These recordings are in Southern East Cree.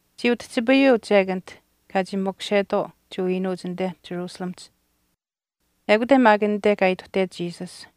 Chii utihchipayuu chek anit kaa chii makushetwaau Jewa iinuuch anite Jerusalemihch, ekute maak anite kaa ituhtet Jesus.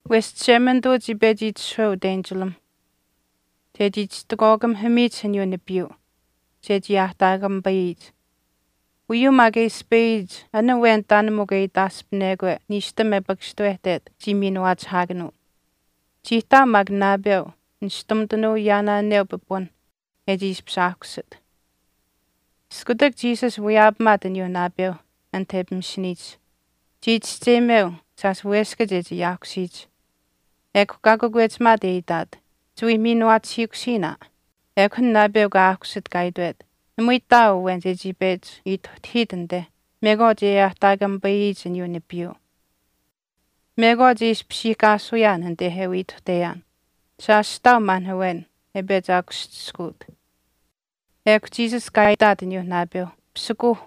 Wesh Chishemanituu chii pechi itishahweu utenchilamh chechii chistikwaakamihamiyich aniyuu nipiiyuu chechii aahtaakamipayiyich. Uyuu maak e ispayiyich aniyuu nipiiyuu, an awen taan mikw e itaaspinekwe niishtam e pakashtuwehtet chii miinuwaachihaakanuu. Chii ihtaau maak naapeu nishtumitanuu yaanaaneu pipun e chii ishpish aahkusit. Iskutak Jesus wiyaapamaat aniyuu naapeu anit e pimishiniyich, chii chischeyimeu shaash weskach e chii aahkusiyich, ekw kaa kakwechimaat e itaat, “Chiwii miinuwaachihiikusiin aa.” Ekw an naapeu kaa aahkusit kaa itwet, “Namui ihtaau awen chechii pechi ituhtahiit anite mekwaach e aahtaakamipayiyich aniyuu nipiiyuu. Mekwaach e ishpishiihkaasuyaan anite e wii ituhteyaan shaash ihtaau maan awen e pechi aakuschiskuut.” Ekw Jesus kaa itaat aniyuu naapeu, “Pisikuuh,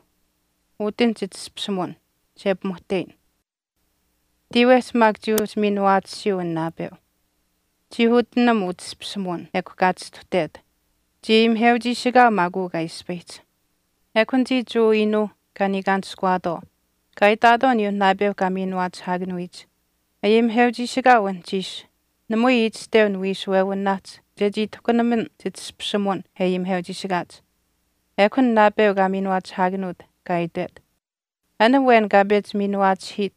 utinh chitashpishimuwin che pimuhteyin.” Tiiwehch maak chii uhchi miinuwaatisiyuu an naapeu. Chii utinam utashpishimuwin ekw kaa chistuhtet. Chii ayimiheuchiishikaau maak uu kaa ispayihch. Ekw anichii Jewa iinuuh kaa niikaanishkuwaatwaau kaa itaatwaau aniyuu naapeu kaa miinuwaachihaakanuyich, “Ayimiheuchiishikaau anuhchiish namui itashteu niwiishuwewinaahch chechii tahkunaman chitashpishimuwin e ayimiheuchiishikaach.” Ekw an naapeu kaa miinuwaachihaakanuut kaa itwet, “An awen kaa pechi miinuwaachihiit,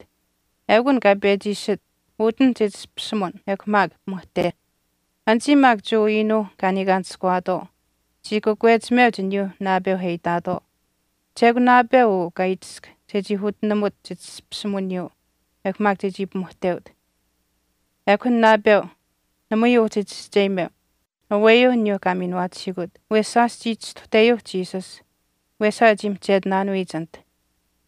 eukw an kaa pechi iishit, utinh chitashpishimuwin ekw maak pimuhteh.” Anichii maak Jewa iinuuh kaa niikaanishkuwaatwaau chii kakwechimeuch aniyuuh naapeu e itaatwaau, “Chekw naapeu uu kaa itisk chechii utinamut chitashpishimuwiniyuu ekw maak chechii pimuhteut.” Ekw an naapeu namui uhchi chischeyimeu aweyuu aniyuu kaa miinuwaachihiikut wesh shaash chii chistuhteyuuh Jesus wesaa e chii mihchetinaanuyich anit.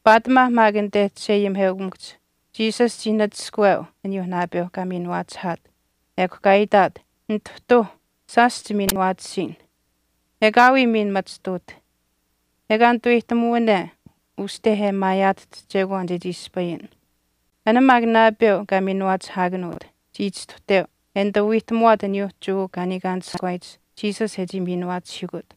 Paatimaa maak anite chisheayimiheukamikuhch Jesus chii nachishkaweu aniyuu naapeu kaa miinuwaachihaat ekw kaa itaat, “Nituhtuuh, shaash chimiinuwaatisiin. Ekaawii miin machituut, ekaa netuweyihtamuwane uste e maayaatahch chekwaan chechii ispayin.” An maak naapeu kaa miinuwaachihaakanuut chii chistuhteu e nituu wiihtamuwaat aniyuu Jewa kaa niikaanishkuwaayich Jesus e chii miinuwaachihiikut.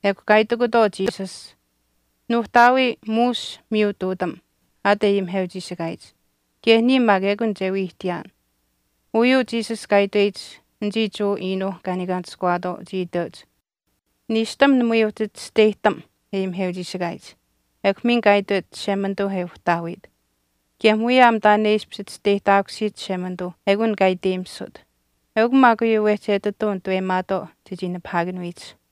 Ekw kaa itikutwaau Jesus, “Nuuhtaawii muush miyutuutam aat e ayimiheuchiishikaayich, kaye niya maak ekun che wii ihtiyaan.” Uyuu Jesus kaa itweyich, anichii Jewa iinuuh kaa niikaanishkuwaatwaau chii iteuch, “Niishtam namui uhchi chisteyihtam e Jewa ayimiheuchiishikaayich ekw miin kaa itwet Chishemanituu e Uhtaawiit. Kaye muyaam taan e ishpish chisteyihtaakusiyich Chishemanituu ekun kaa e iteyimisut. Eukw maak uyuu wehchi etituu nituweyimaatwaau chechii nipahaakanuyich.”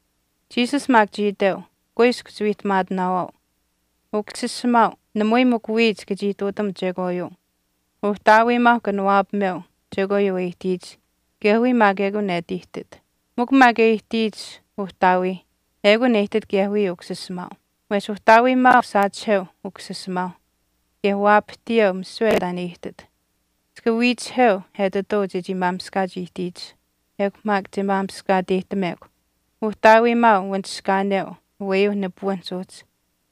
Jesus maak chii iteu, “Kuiskw chiwiihtamaatinaawaau, Ukusisimaau namui mikw wiya chika chii ihtuutam chekwaayuu. Uhtaawiimaauh kanawaapameu chekwaayuu e ihtiyich kaye wiya maak ekun e ati ihtit. Mikw taan e ihtiyich Uhtaawiih ekun e ihtit kaye wiya Ukusisimaau. Wesh Uhtaawiimaau saachiheu Ukusisimaauh kaye waapahtiyeu misiwe taan e ihtit. Chika wiichiheu etituu chechii maamishkaach ihtiyich. Ekw maak che maamishkaateyihtamekw. Uhtaawiimaau wanishkaaneu aweyuu nipuwinihch uhchi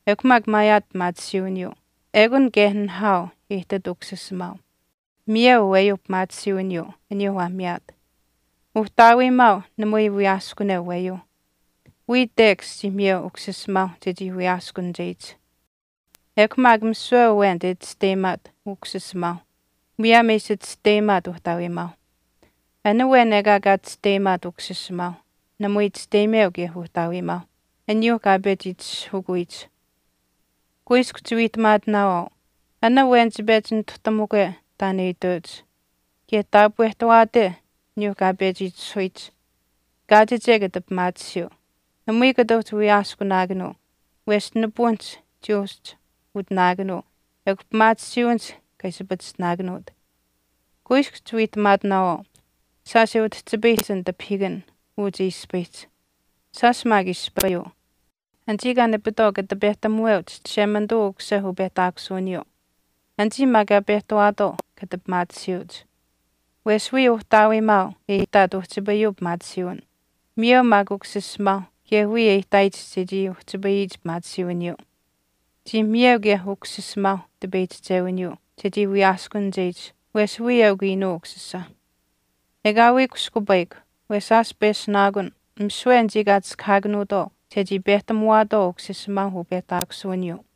ekw maak maayaat pimaatisiiwiniyuu, ekun kaye nihaau e ihtit Ukusisimaau, miyeu aweyuu pimaatisiiwiniyuu aniyuu waa miyaat. Uhtaawiimaau namui wiyaaskuneu aweyuu. Wiya tekash chii miyeu Ukusisimaau chechii wiyaaskunicheyich. Ekw maak misiwe awen che chisteyimaat Ukusisimaau muyaam e ishi chisteyimaat Uhtaawiimaau. An awen ekaa kaa chisteyimaat Ukusisimaau namui chisteyimeu kaye Uhtaawiimaau aniyuu kaa pechi itishahukuyich.” “Kuiskw chiwiihtamaatinaawaau, an awen che pechi nituhtamukwe taan e iteuch kaye taapwehtawaate aniyuu kaa pechi itishahuyich kaachiche kata pimaatisiyuu. Namui kata uhchi wiyaaskunaakanuu wesh nipuwinihch chii uhchi utinaakanuu ekw pimaatisiiwinihch kaa ishi pachishtinaakanuut. Kuiskw chiwiihtamaatinaawaau shaash e utihchipayihch an tipahiikan uu che ispayihch, shaash maak ispayuu, anichii kaa nipitwaau kata pehtamuweuch Chishemanituu Ukusisa upehtaakusuwiniyuu. Anichii maak kaa pehtawaatwaau kata pimaatisiyuuch. Wesh wiya Uhtaawiimaau e ihtaat uhchipayuu pimaatisiiwin, miyeu maak Ukusisimaauh kaye wiya e ihtaayich chechii uhchipayiyich pimaatisiiwiniyuu. Chii miyeu kaye Ukusisimaauh tipeyihchichewiniyuu chechii wiyaaskunicheyich wesh wiya eukw Iinuu Ukusisa. Ekaawii kushkupayikw, wesh shaash peshunaakun misiwe anichii kaa chiskahaakanuutwaau chechii pehtamuwaatwaau Ukusisimaau upehtaakusuwiniyuu,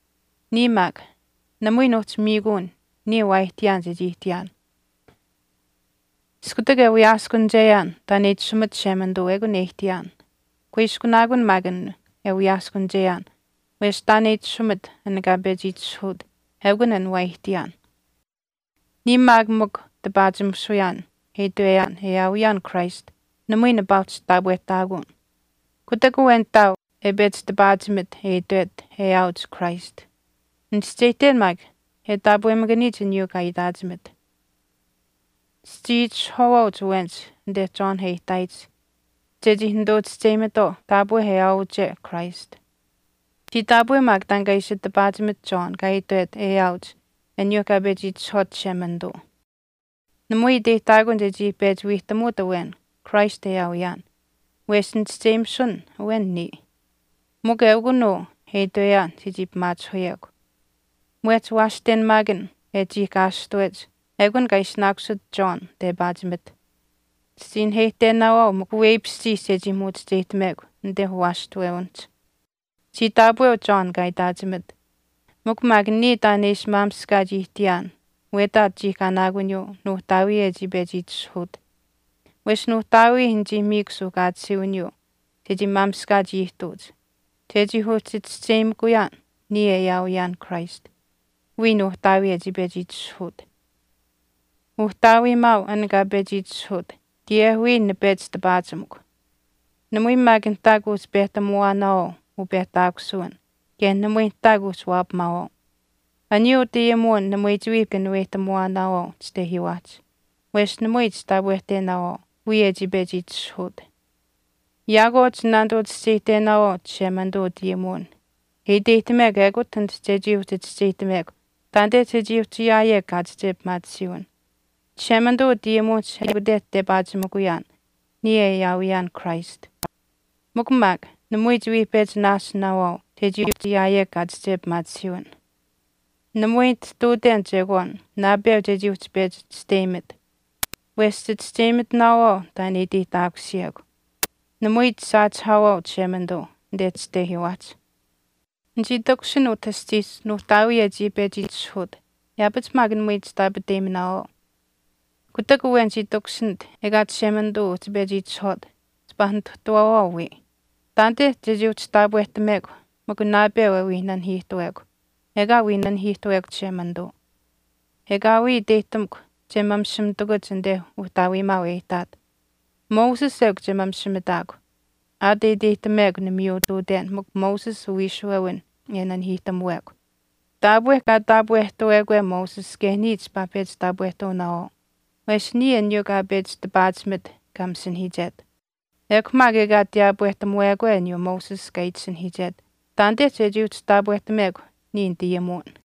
“Niya maak, namui nuuhchi miikuun niya waa ihtiyaan chechii ihtiyaan, Iskutak e wiyaaskunicheyaan taan e itashumit Chishemanituu ekun e ihtiyaan. Kuiskunaakun maak an e wiyaaskunicheyaan wesh taan e itashumit an kaa pechi itishahuut ekun an waa ihtiyaan.” “Niya maak mikw tipaachimisuyaan e itweyaan e aawiyaan Christ namui nipaa uhchi taapwehtaakun. Kutak awen ihtaau e pechi tipaachimit e itwet e aawiyuuch Christ, nichischeyihten maak e taapwemakaniyich aniyuu kaa itaachimit. Chichii itishahwaawaauch awenich anite John e ihtaayich chechii nituchischeyimitwaau taapwe e aawiyuuche Christ. Chii taapweu maak taan kaa ishi tipaachimit John kaa itwet e aawiyuuch aniyuuh kaa pechi itishahwaat Chishemanituu. Namui iteyihtaakun chechii pechi wiihtamuut awen Christ e aawiyaan, wesh nichischeyimisun awen niya. Mikw ekun uu e itweyaan chechii pimaachihuyekw. Mwehch waashtenamaakan e chiihkaashtuwech ekun kaa ishinaakusit John tepaachimit. Chichii naheyihtenaawaau mikw weipishchiish chechii muuchicheyihtamekw anite uwaashtuwewinihch. Chii taapweu John taan kaa itaachimit, mikw maak niya taan e ishi maamishkaach ihtiyaan wetaach chiihkanaakuniyuu nuuhtaawii e chii pechi itishahuut. Wesh Nuuhtaawii nichii miikw suuhkaatisiiwiniyuu chechii maamishkaach ihtuuch chechii uhchi chischeyimakuyaan niya e aawiyaan Christ, wiya Nuuhtaawii e chii pechi itishahut. Uhtaawiimaau an kaa pechi itishahuut kaye wiya nipechi tipaachimikw. Namui maak nihtaa kuuhchi pehtamuwaanaawaau upehtaakusuwin kaye namui nihtaa kuuhchi waapamaawaau. Aniyuu utayimuwin namui chiwii kanuweyihtamuwaanaawaau chitehiiwaahch wesh namui chitaapwehtenaawaau wiya e chii pechi itishahuut. Yaakwaau chinaanituu chischeyihtenaawaau Chishemanituu utayimuwin e iteyihtamekw ekut anit chechii uhchi chischeyihtamekw taanite chechii uhchi ayaayekw kaachiche pimaatisiiwin. Chishemanituu utayimuwinihch ekute tepaachimikuyaan niya e aawiyaan Christ. Mikw maak namui chiwii pechi naasinaawaau chechii uhchi ayaayekw pimaatisiiwin.” “Namui nitihtuuten chekwaan naapeu chechii uhchi pechi chisteyimit. Wesh chichischeyimitinaawaau taan e iteyihtaakusiyekw. Namui chisaachihaawaau Chishemanituu anite chitehiiwaahch. Nichii takushin utah aschiihch Nuuhtaawii e chii pechi itishahuut yaapach maak namui chitaapateyiminaawaau. Kutak awen chii takushinit ekaa Chishemanituu uhchi pechi itashuwaat chipaa Nituhtaawawaau wiya. Taanite chechii uhchi taapwehtamekw mikw naapeu e wii nanihiiwehekw ekaa wii nanihiiwehekw Chishemanituu. Ekaawii iteyihtamukw che mamishimitakuch anite Uhtaawiimaau e ihtaat. Moses eukw che mamishimitaakw aat e iteyihtamekw nimiyuututenaan mikw Moses uwiishuwewin e nanihiihtamuwekw. Taapwe kaa taapwehtawekwe Moses kaye niya chipaa pechi taapwehtuunaawaau wesh niya aniyuu kaa pechi tipaachimit kaa masinahiichet. Ekw maak ekaa tiyaapwehtamuwekwe aniyuu Moses kaa itisinahiichet, taanite chechii uhchi taapwehtamekw niya nitayimuwin.”